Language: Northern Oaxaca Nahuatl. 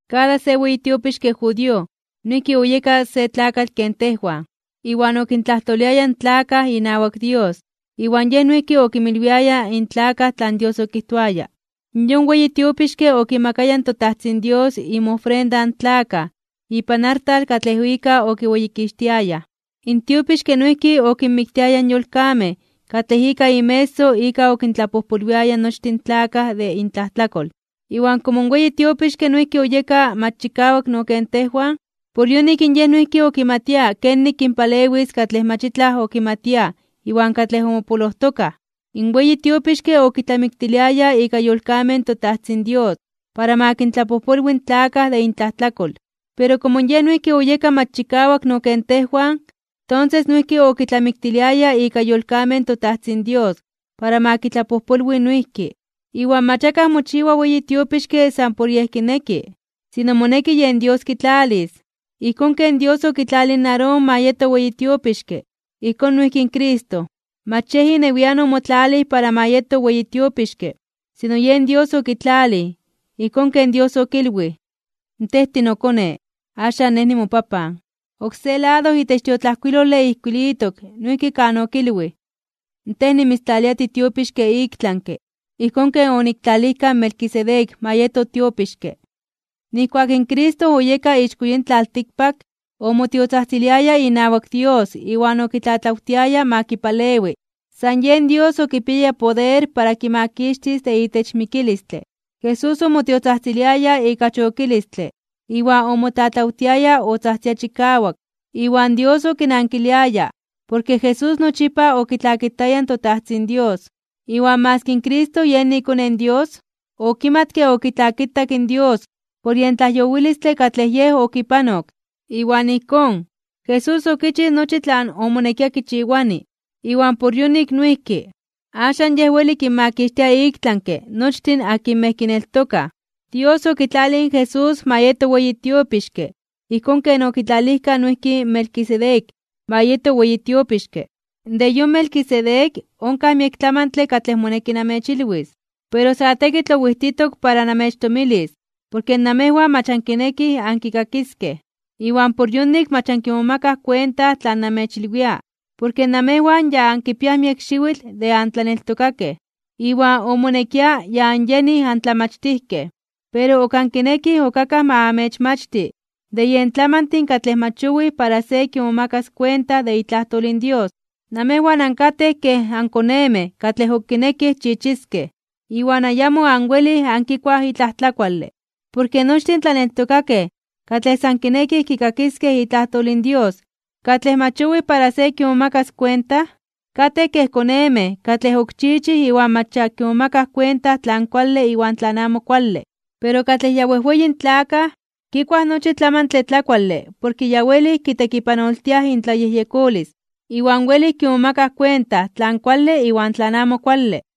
Kada se weyi tiopixke judío noijki oyeka se tlakatl ken tejwan, iwan okintlajtoliaya in tlakaj inawak Dios iwan yej noijki okinmilwiaya in tlakaj tlan Dios okijtoaya. Yon weyi tiopixke okimakaya in toTajtzin Dios inmofrenda in tlakaj ipan artal katlej ika okiweyikixtiayaj, in tiopixke noijki okinmiktiaya yolkamej katlej ika inmeso ika okintlapojpolwiaya nochtin in tlakaj de intlajtlakol. Iwan komo in yon weyi tiopixke noijki oyeka mach chikawak no ken tejwan, por yonik in yej noijki okimatia kenik kinpalewis katlej mach itlaj okimatiaj iwan katlej omopolojtokaj. In weyi tiopixke okitlamiktiliaya ika yolkamej in toTajtzin Dios para ma kintlapojpolwi in tlakaj de intlajtlakol, pero komo yej noijki oyeka mach chikawak no ken tejwan, tonses noijki okitlamiktiliaya ika yolkamej in toTajtzin Dios para ma kitlapojpolwi noijki. Iwan mach akaj mochiwa weyi tiopixke san por yej kineki, sino moneki yen Dios kitlalis, ijkón ken Dios okitlalij in Aarón ma yeto weyi tiopixke. Ijkón noijki in Cristo. Mach yen inewian omotlalij para ma yeto weyi tiopixke, sino yen Dios okitlalij. Ijkón ken Dios okilwij: Tej tinoKone. Axan Nej nimoPapan. Oksé lado itech tiotlajkuilole ijkuilitok noijki kan okilwij: Tej nimitztlalia tiTiopixke iktlanke (ik tlami), ijkón ken oniktlalijka in Melquisedec ma yeto tiopixke. Nijkuak in Cristo oyeka ixko yin tlaltikpak, omotiotzajtziliaya inawak Dios iwan okitlatlawtiaya ma kipalewi. San yen Dios okipiaya poder para kimakixtis de itech mikilistle. Jesús omotiotzajtziliaya ika chokilistle iwan omotlatlawtiaya otzajtzia chikawak, iwan Dios okinankiliaya porke Jesús nochipa okitlakitaya in toTajtzin Dios. Iwan maski in Cristo Yej iKone in Dios, okimatke okitlakitak in Dios por yen tlajyowilistle katlej Yej okipanok. Iwan ijkón, Jesús okichij nochi tlan omonekia kichiwani. Iwan por yonik noijki, axan Yej weli kinmakixtia iktlanke (ik tlami) nochtin akinmej kineltokaj. Dios okitlalij in Jesús ma yeto weyi tiopixke ijkón ken okitlalijka noijki in Melquisedec ma yeto weyi tiopixke. De yon Melquisedec onkaj miek tlamantle katlej moneki namechilwis. Pero sa tekitl owijtitok para namechtomilis porke namejwan mach ankinekij ankikakiskej, iwan por yonik mach ankimomakaj kuenta tlan namechilwia. Porke namejwan ya ankipiaj miek xiwitl de antlaneltokakej, iwan omonekia ya anyenij antlamachtijkej. Pero ok ankinekij ok akaj ma amechmachti de yen tlamantin katlej mach owij para se kimomakas kuenta de itlajtol in Dios. Namejwan ankatej kej ankonemej katlej ok kinekij chichiskej, iwan ayamo anwelij ankikuaj itlaj tlakuale. Porke nochtin tlaneltokakej katlej san kinekij kikakiskej itlajtol in Dios katlej mach owij para se kimomakas kuenta, katej kej konemej katlej ok chichij iwan mach ya kimomakaj kuenta tlan kuale iwan tlan amo kuale. Pero katlej ya wejweyin tlakaj kikuaj nochi tlamantle tlakuale porke ya welij kitekipanoltiaj intlayejyekolis iwan welij kimomakaj kuenta tlan kuale iwan tlan amo kuale.